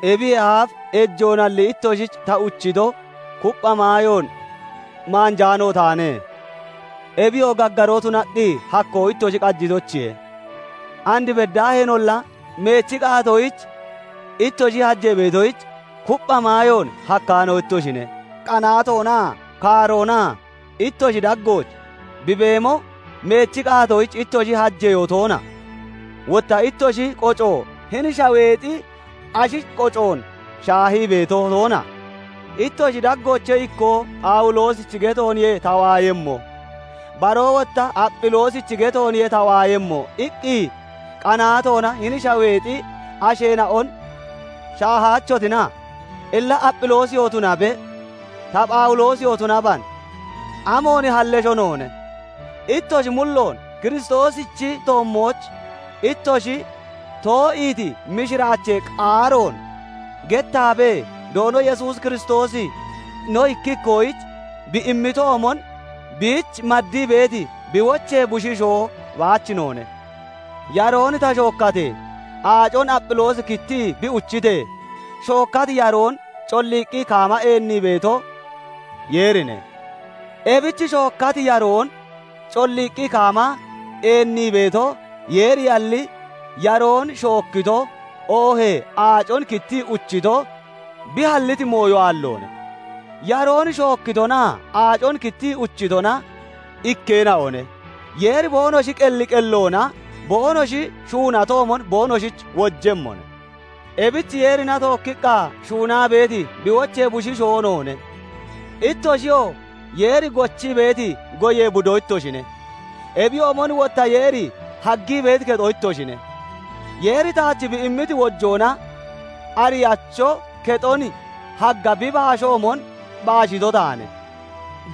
Ebiyee aaf ejoonalli ittoshich ta uchito, kuppha maayoon maanjaano taane; ebiyoo gaggaroo tunaqqi hakkoo ittoshi qajitoyichiye; and beddaaheenolla meechi qaatoyich ittoshi hajee beetoyich, kuppha maayoon hakkaano ittoshine. Qanaatoonaa kaaroona ittoshi daggooch bi beemo, meechi qaatoyich ittoshi hajeyoo toona? Wotta ittoshi qoco hini shaweexi ashi qocoon shaahii beeto toona? Ittoshi daggoochee ikkoo "Phawuloosichi getooniye ta waayemmo", baroo wotta "Aphiloosichi getooniye ta waayemmo" iqqi qanaatoona hini shaweexi asheena'on shaahaachotina? Illa Aphiloosiyoo tunabe, ta Phawuloosiyoo tunaban, amoon hallesho noone? Ittoshi mulloon Kiristoosichi toommooch ittoshi too'iiti mishiraachee qaaroon gettaabee, Doono Yesuus Kiristoosi no ikki ikkoyich bi immitoomon, biich maddii beeti bi wochee bushiishoo baach noone. Yaroon ta shookkatee, aacon Aphiloosi kittii bi uchitee, shookkati yaroon colliiqqi kaama eenniito, Yeerine. Ebich shookkati yaroon colliiqqi kaama eennii beeto, Yeeriyalli, yaroon shookkito, oohee aacon kittii uchito, bi halliti mooyo aalloone. Yaroon shookkitonaa aacon kittii uchitona ikkeena'one. Yeeri boonoshi qelli qelloona boonoshi shuunatoomon boonoshich wojemmone. Ebich Yeerina tookkiqqa shuunaa beeti bi wochee bushiishoo noone; ittoshiyoo Yeeri gochii beeti goyee budo ittoshine; ebiyoomon wotta Yeeri haggii beeti kexo ittoshine. Yeeri taach bi immiti wojoona ariyacho kexon hagga bi baashoomon baashito taane;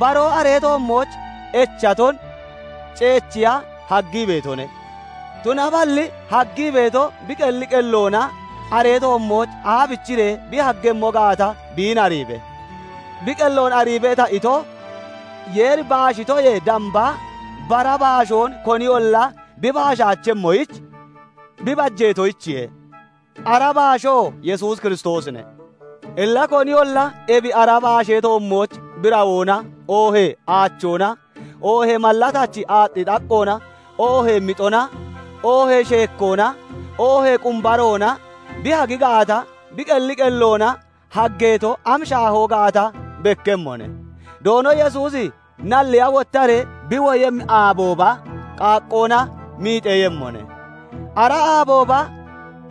baroo aree toommooch echaton ceechiya haggii beetone. Tunaballi haggii beeto bi qelli qelloona aree toommooch aabichiree bi haggemmo gaata, biin ariibe. "Bi qelloon ariibe" ta ito, Yeeri baashitoyee damba bara baashoon koniyolla bi baashaachemmoyich, bi bajeetoyichiye; ara baashoo Yesuus Kiristoosine. Illa koniyolla ebi ara baashee toommooch birawoona, oohee aachoona, oohee mallatachi aaxxi xaqqoona, oohee mixona, oohee sheekkoona, oohee qumbaroona bi hagi gaata, bi qelli qelloona haggeeto am shaahoo gaata bekkemmone; Doono Yesuusi nalliya wottaree bi woyemmi aabooba, qaaqqoona miixeeyemmone; ara aabooba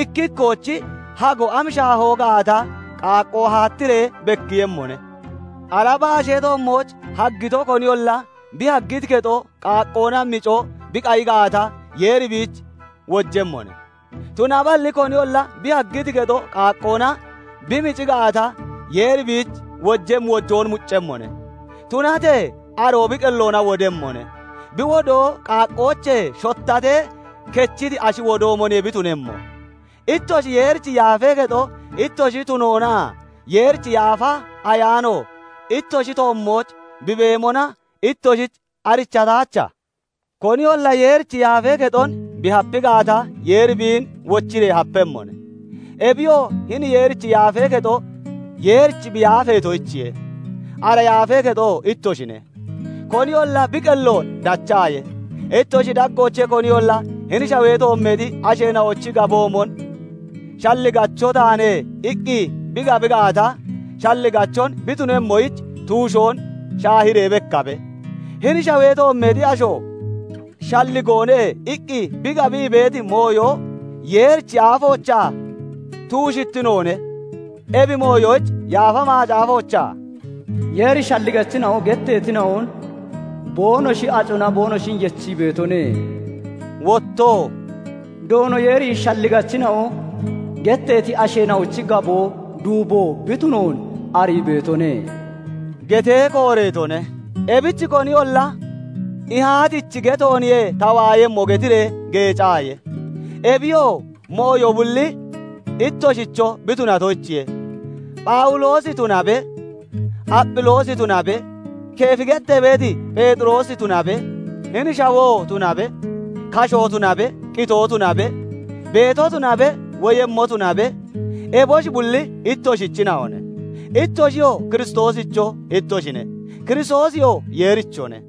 ikki ikkoochi hago am shaahoo gaata qaaqqoo haattiree bekkiiyemmone. Ara baashee toommooch haggito koniyolla bi haggiti kexo qaaqqoona mico bi qayi gaata, Yeeri biich wojemmone. Tunaballi koniyolla bi haggiti kexo qaaqqoona bi mici gaata, Yeeri biich wojemmi wojoon muccemmone; tunatee aroo bi qelloona wodemmone; bi wodoo qaaqqoochee shottatee kechiti ashi wodoomoniye bi tunemmo. Ittoshi Yeerichi yaafee kexo ittoshi tunoonaa Yeerichi Yaafa Ayaano ittoshi toommooch bi beemona ittoshich arichataacha? Koniyolla Yeerichi yaafee kexon bi hapi gaata, Yeeri biin wochiree hapemmone; ebiyoo hini Yeerichi yaafee kexo Yeerich bi yaafeetoyichiye; ara yaafee kexoo ittoshine. Koniyolla bi qelloon dachaaye. Ittoshi daggoochee koniyolla hini shawee toommeexi asheena'ochi gaboomon "Shalligacho taane" iqqi bi gabi gaata, shalligachon bi tunemmoyich, tuushoon shaahiree bekkabe. Hini shawee toommeexi asho "Shalligoone" iqqi bi gabii beeti mooyo Yeerichi aafoochaa tuushittinoone. Ebi mooyoyich Yaafa Macaafoochaa "Yeeri shalligachina'o getteetina'on boonoshi acona boonoshin yechii beetone", wottoo "Doono Yeeri shalligachina'o getteeti asheena'ochi gaboo duubo bi tunoon arii beetone" getee kooreetone. Ebich koniyolla "Ihaatichi getooniye ta waayemmo" getiree geecaaye. Ebiyoo mooyo bulli ittoshicho bi tunatoyichiye. Phawuloosi tunabe, Aphiloosi tunabe, Keefi gettee beeti Pheexiroosi tunabe, hini shawoo tunabe, kashoo tunabe, qitoo tunabe, beetoo tunabe, woyemmoo tunabe, eboshi bulli ittoshichina'one; ittoshiyoo Kiristoosicho ittoshine; Kiristoosiyoo Yeerichone.